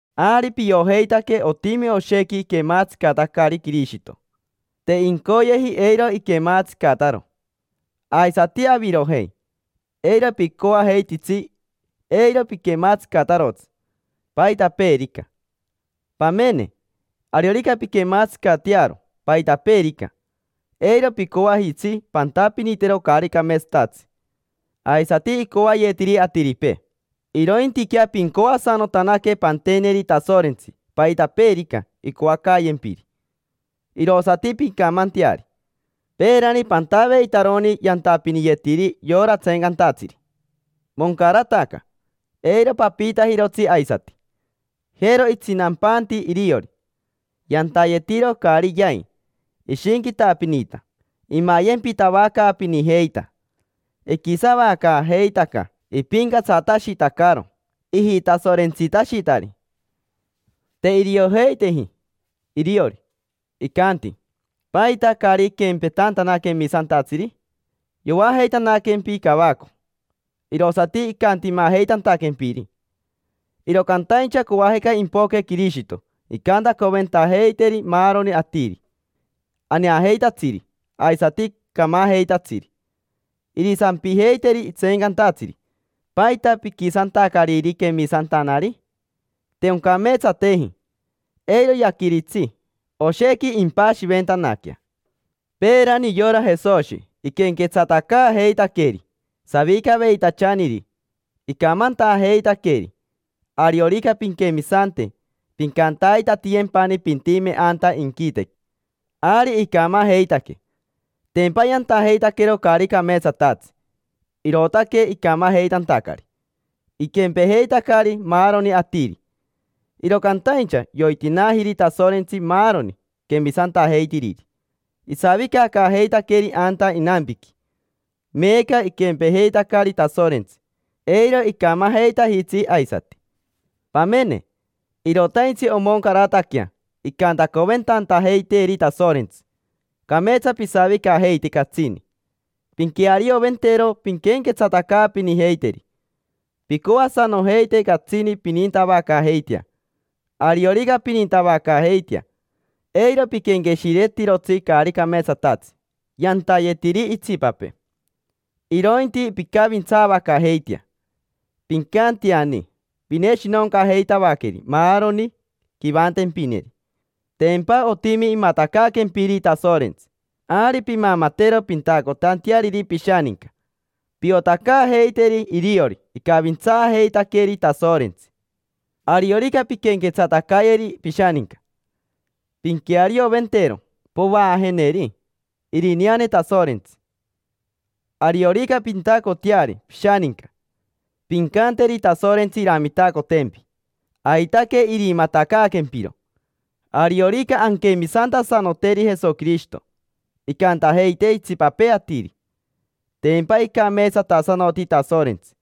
Ari piojeitaque otimi oshequi iquematsicatacari Quirishito, te incoyeji eiro iquematsicataro. Aisati avirojei, eiro picoajeititsi eiro piquematsicatarotsi paitapeerica. Pamene, ariorica pinquematsicatearo paitapeerica, eiro picoajitsi pantapinitero caari cameetsatatsi aisati icoayetiri atiripee. Irointiquea pincoasanotanaque panteneri Tasorentsi paitapeerica incoacayempiri, irosati pincamanteari. Peerani pantaveitaroni yantapiniyetiri yora tseencantatsiri: moncarataca, eiro papiitajirotsi aisati. Jero itsinampanti iriori, yantayetiro caari yai, ishinquitapinita, imayempitavacaapinijeita, iquisavacaajeitaca, ipincatsatashitacaro ijitasorentsitashitari. Te iriojeiteji iriori, icanti: “¿Paita caari iquempetantana quemisantatsiri?” Yoajeitanaquempi cavaco, irosati icantimajeitantaquempiri. Iro cantaincha coajica impoque Quirishito incantacoventajeiteri maaroni atiri: aneajeitatsiri aisati camajeitatsiri. Irisampijeiteri tseencantatsiri: “¿Paita piquisantacariri quemisantanari? Te oncameetsateji”. Eiro yaquiritsi, oshequi impashiventanaquea. Peerani yora Jesoshi iquenquetsatacaajeitaqueri savicaveitachaniri, icamantajeitaqueri: “Ariorica pinquemisante, pincantaitatiyempani pintime anta inquitequi”. Ari icamajeitaque: tempa yantajeitaquero caari cameetsatatsi, irootaque icamajeitantacari, iquempejeitacari maaroni atiri. Iro cantaincha yoitinaajiri Tasorentsi maaroni quemisantajeitiriri, isavicacaajeitaqueri anta inampiqui. Meeca iquempejeitacari Tasorentsi: eiro icamajeitajitsi aisati. Pamene, irotaintsi omoncarataquea incantacoventantajeiteeri Tasorentsi. Cameetsa pisavicajeite catsini, pinquearioventero pinquenquetsatacaapinijeiteri. Pincoasanojeite catsini pinintavacaajeitea. Ariorica pinintavacaajeitea, eiro piquenqueshiretirotsi caari cameetsatatsi yantayetiri itsipapee, irointi pincavintsaavacaajeitea. Pincanteani pineshinoncajeitavaqueri maaroni quivantempineri. Tempa otimi imatacaaquempiri Tasorentsi, ari pimamatero pintacotanteariri pishaninca. Piotacaajeiteri iriori icavintsaajeitaqueri Tasorentsi. Ariorica pinquenquetsatacayeri pishaninca, pinquearioventero povaajeneri irineane Tasorentsi. Ariorica pintacoteari pishaninca, pincanteri Tasorentsi iramitacotempi, aitaque irimatacaaquempiro. Ariorica anquemisantasanoteri Jesoquirishito, incantajeite itsipapee atiri: “Tempa icameetsatasanoti Tasorentsi”.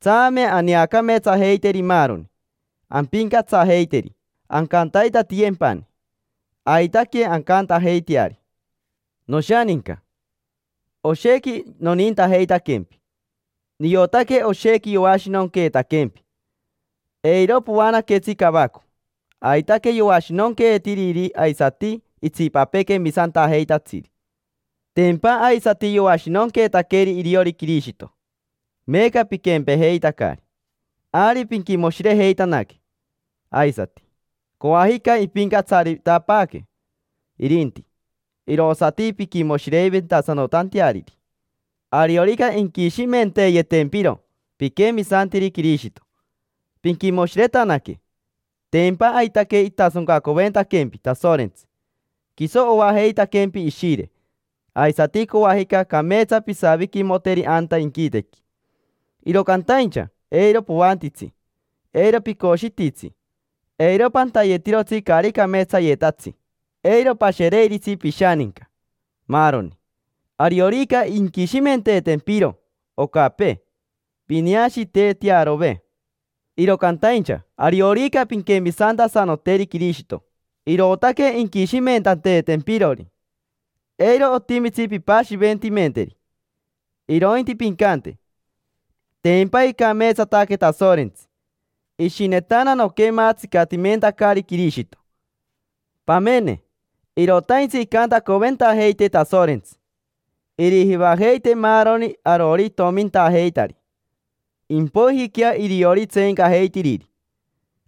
Tsame aneacameetsajeiteri maaroni, ampincatsajeiteri: ancantaitatiyempani. Aitaque ancantajeiteari. Noshaninca, oshequi nonintajeitaquempi. Niotaque oshequi yoashinonqueetaquempi. Eiro poanaquetsi cavaco, aitaque yoashinonqueetiri aisati itsipapee quemisantajeitatsiri. Tempa aisati yoashinonqueetaqueri iriori Quirishito, meeca piquempejeitacari: ari pinquimoshirejeitanaque. Aisati, coajica impincatsaritapaaque irinti, irosati pinquimoshireventasanotanteariri. Ariorica inquishimenteeyetempiro piquemisantiri Quirishito, pinquimoshiretanaque: tempa aitaque itasoncacoventaquempi Tasorentsi. Quiso oajeitaquempi Ishire, aisati coajica cameetsa pisaviquimoteri anta inquitequi. Iro cantaincha eiro poantitsi, eiro picoshititsi, eiro pantayetirotsi caari cameetsayetatsi, eiro pashereiritsi pishaninca, maaroni. Ariorica inquishimenteetempiro ocapee, pineashiitetearove. Iro cantaincha ariorica pinquemisantasanoteri Quirishito, irootaque inquishimentanteetempirori, eiro otimitsi pimpashiventimenteri. Irointi pincante: “Tempa icameetsataque Tasorentsi, ishinetana noquematsicatimentacari Quirishito”. Pamene, irotaintsi incantacoventajeitee Tasorentsi: irijivajeitee maaroni arori itomintajeitari, impoijiquea iriori tseencajeitiriri.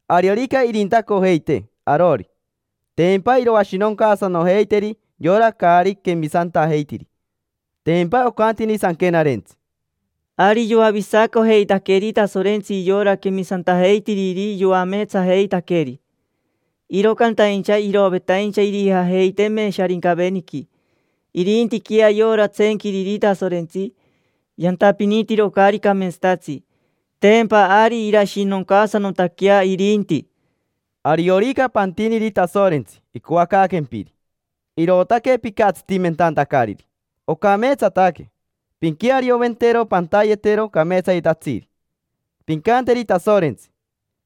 Ariorica irintacojeitee arori, tempa iroashinoncaasanojeiteri yora caari quemisantajeitiri. Tempa ocantini Sanquenarentsi: “Ari yoavisacojeitaqueri Tasorentsi yora quemisantajeitiriri yoameetsajeitaqueri, iro cantaincha irovetaincha irijajeiteme Sharincaveniqui. Irintiquea yora tseenquiriri Tasorentsi, yantapinitiro caari cameetsatatsi: tempa ari irashinoncaasanotaquea irinti”. Ariorica pantiniri Tasorentsi icoacaaquempiri, irootaque picatsitimentantacariri, ocameetsataque. Pinquearioventero pantayetero cameetsayetatsiri. Pincanteri Tasorentsi: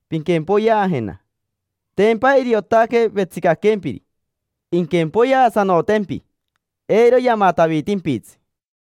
“Pinquempoyeajena”. Tempa iriotaque vetsicaquempiri, inquempoyeasanotempi, eiro yamatavitimpitsi.